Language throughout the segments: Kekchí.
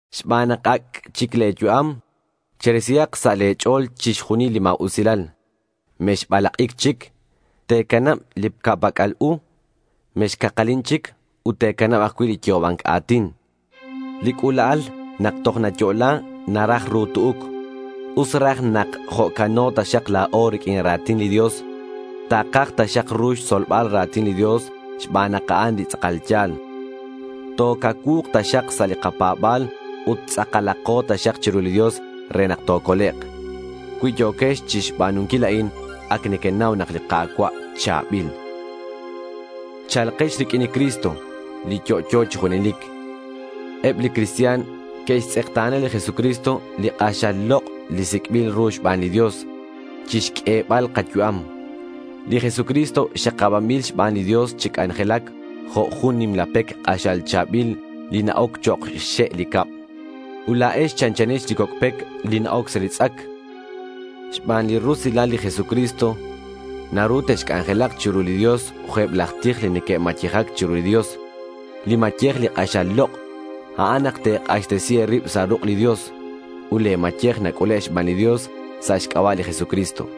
Xban nak ac' chic le̱ yu'am, cherisihak sa' le̱ ch'o̱l chixjunil li ma̱usilal. Mexbalak'ic chic. Te̱canab li ca'pac'al u. Mexcakalin chic ut te̱canab ajcui' li yo'oba̱nc a̱tin. Li c'ula'al nak toj nayo'la naraj ru tu'uc. Us raj nak jo'cano taxak la̱o riq'uin ra̱tin li Dios. Takaj taxak ru xtzolbal ra̱tin li Dios xban nak a'an li tz'akal ya̱l. Tocacuu̱k taxak sa' li kapa̱ba̱l ut tz'akalako taxak chiru li Dios re nak tocolek'. Cui yo̱quex chixba̱nunquil a'in, ac nequenau nak li Ka̱cua' cha̱bil. Cha̱lkex riq'uin li Cristo, li yo'yo chi junelic. Eb li cristian que'xtz'ekta̱na li Jesucristo li k'axal lok' li sic'bil ru xban li Dios chixq'uebal kayu'am. Li Jesucristo xakabanbil xban li Dios chi c'anjelac jo' jun nimla pec k'axal cha̱bil li na-oc chok' xxe' li cab. Ut la̱ex chanchanex li coc' pec li na-oc sa' li tz'ac. Xban li rusilal li Jesucristo, naru texc'anjelak chiru li Dios jo' eb laj tij li neque'mayejac chiru li Dios. Li mayej li k'axal lok', a'an nak te̱k'axtesi e̱rib sa' ruk' li Dios. Ut le̱ mayej nac'ule' xban li Dios sa' xc'aba' li Jesucristo.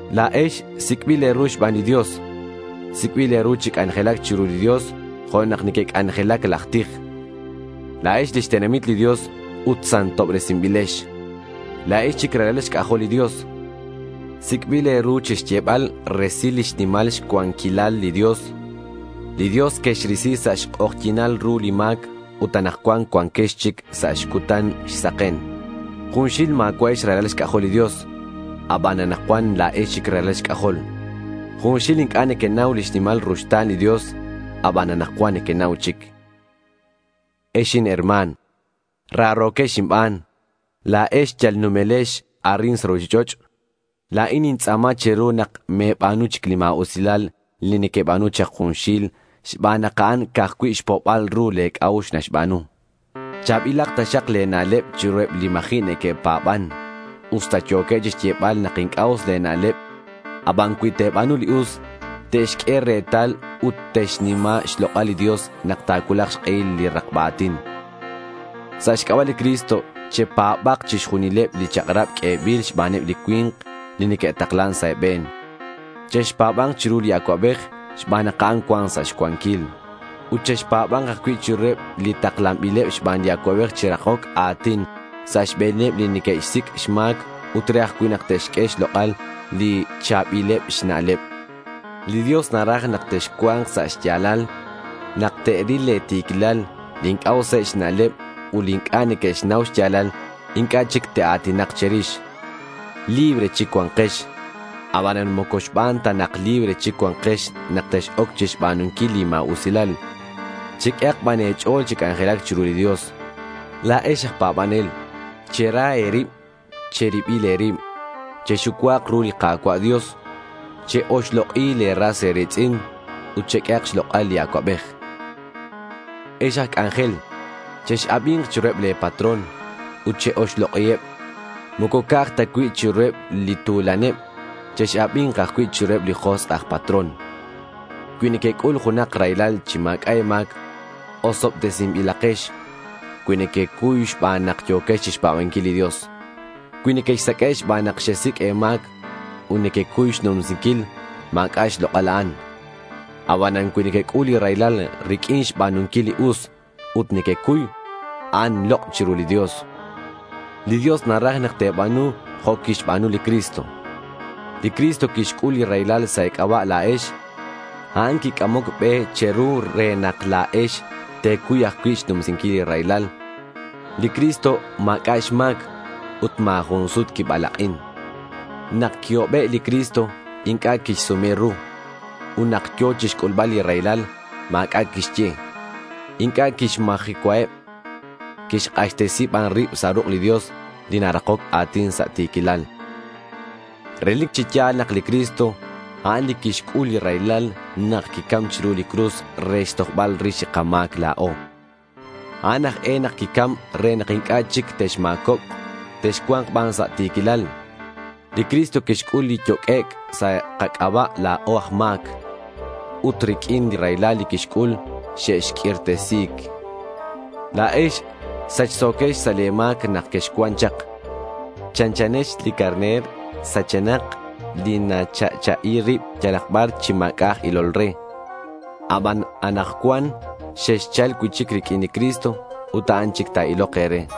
La̱ex sic'bil e̱ru xban li Dios. Sic'bil e̱ru chi c'anjelac chiru li Dios jo' nak neque'c'anjelac laj tij. La̱ex lix tenamit li Dios ut santobresinbilex. La̱ex chic ralal xc'ajol li Dios. Sic'bil e̱ru chixyebal resil lix nimal xcuanquilal li Dios. Li Dios quexrisi sa' xk'ojyi̱nal ru li ma̱c ut anakcuan cuanquex chic sa' xcutan xsaken. Junxil ma̱cua'ex ralal xc'ajol li Dios. Aban anakcuan la̱ex chic ralal xc'ajol. Junxil inc'a' nequenau lix nimal ruxta̱n li Dios. Aban anakcuan nequenau chic. Ex inherma̱n, raro̱quex inban. La̱ex yal numelex arin sa' ruchich'och'. La̱in nintz'a̱ma che̱ru nak me̱ba̱nu chic li ma̱usilal li queba̱nu chak junxil xban nak a'an ca'aj cui' xpo'bal ru le̱ c'a'ux naxba̱nu. Cha̱bilak taxak le̱ na'leb chiruheb li ma̱ji' neque'pa̱ban. Usta yo̱keb chixyebal nak inc'a' us le̱ na'leb, aban cui te̱ba̱nu li us, te'xq'ue retal ut te'xnima xlok'al li Dios nak ta̱cuulak xk'ehil li rakba a̱tin. Sa' xc'aba' li Cristo chepa̱ba̱k chixjunileb li chak'rab q'uebil xbaneb li cui̱nk li neque'taklan sa' e̱be̱n. Chexpa̱ba̱nk chiru li acuabej xban nak a'an cuan sa' xcuanquil. Ut chexpa̱ba̱nk ajcui' chiruheb li taklanbileb xban li acuabej chi rakoc a̱tin sa' xbe̱neb li neque'xsic' xma̱c ut re ajcui' nak te'xq'ue xlok'al li cha̱bileb xna'leb. Li Dios naraj nak texcua̱nk sa' xya̱lal. Nak te'ril le̱ ti̱quilal, li inc'a' useb xna'leb ut li inc'a' neque'xnau xya̱lal, inc'a' chic te'a̱tinak che̱rix. Libre chic cua̱nkex. Abanan moco xban ta nak libre chic cua̱nkex nak tex-oc chixba̱nunquil li ma̱usilal. Cheq'uehak ban e̱ch'o̱l chi c'anjelac chiru li Dios. La̱ex aj pa̱banel, chera e̱rib che̱ribil e̱rib. Chexucua̱k ru li Ka̱cua' Dios. Che-oxlok'i le̱ ras e̱ri̱tz'in. Ut cheq'uehak xlok'al li acuabej. Ex aj c'anjel chex-abi̱nk chiruheb le̱ patrón ut che-oxlok'iheb. Moco ca'aj cui' ta chiruheb li tu̱laneb. Chex-abi̱nk ban ajcui' chiruheb li josk' aj patrón. Cui nequec'ul junak raylal chi ma̱c'a' e̱ma̱c, osobtesinbilakex cui nequecuy xban nak yo̱quex chixpa̱banquil li Dios. Cui nequexsaq'ue' xban nak xesic' e̱ma̱c, ut nequecuy xnumsinquil, ma̱c'a' xlok'al a'an. Abanan cui nequec'ul li raylal riq'uin xba̱nunquil li us ut nequecuy, a'an lok' chiru li Dios. Li Dios naraj nak te̱ba̱nu jo' quixba̱nu li Cristo. Li Cristo quixc'ul li raylal sa' e̱c'aba' la̱ex. A'an quic'amoc be che̱ru re nak la̱ex te̱cuy ajcui' xnumsinquil li raylal. Li Cristo ma̱c'a' xma̱c. Ut ma̱ jun sut quibalak'in. Nak quihobe' li Cristo, inc'a' quixsume ru. Ut nak yo̱ chixc'ulbal li raylal, ma̱c'a' quixye. Inc'a' quixmajecuaheb. Quixk'axtesi ban rib sa' ruk' li Dios, li narakoc a̱tin sa' ti̱quilal. Relic chi ya̱l nak li Cristo, a'an li quixc'ul li raylal nak quicam chiru li cruz re xtojbal rix li kama̱c la̱o. A'an aj e nak quicam re nak inc'a' chic texma̱cobk. Texcua̱nk ban sa' ti̱quilal. Li Cristo quixc'ul li yoq'uec' sa' kac'aba' la̱o aj ma̱c. Ut riq'uin li raylal li quixc'ul xexq'uirtesi̱c. La̱ex sachso̱quex sa' le̱ ma̱c nak quexcuan chak. Chanchanex li carner sachenak li nacha'cha'i rib yalak bar chi ma̱c'a' aj ilol re. Abanan anakcuan xexchal cui'chic riq'uin li Cristo ut a'an chic ta̱ilok e̱re.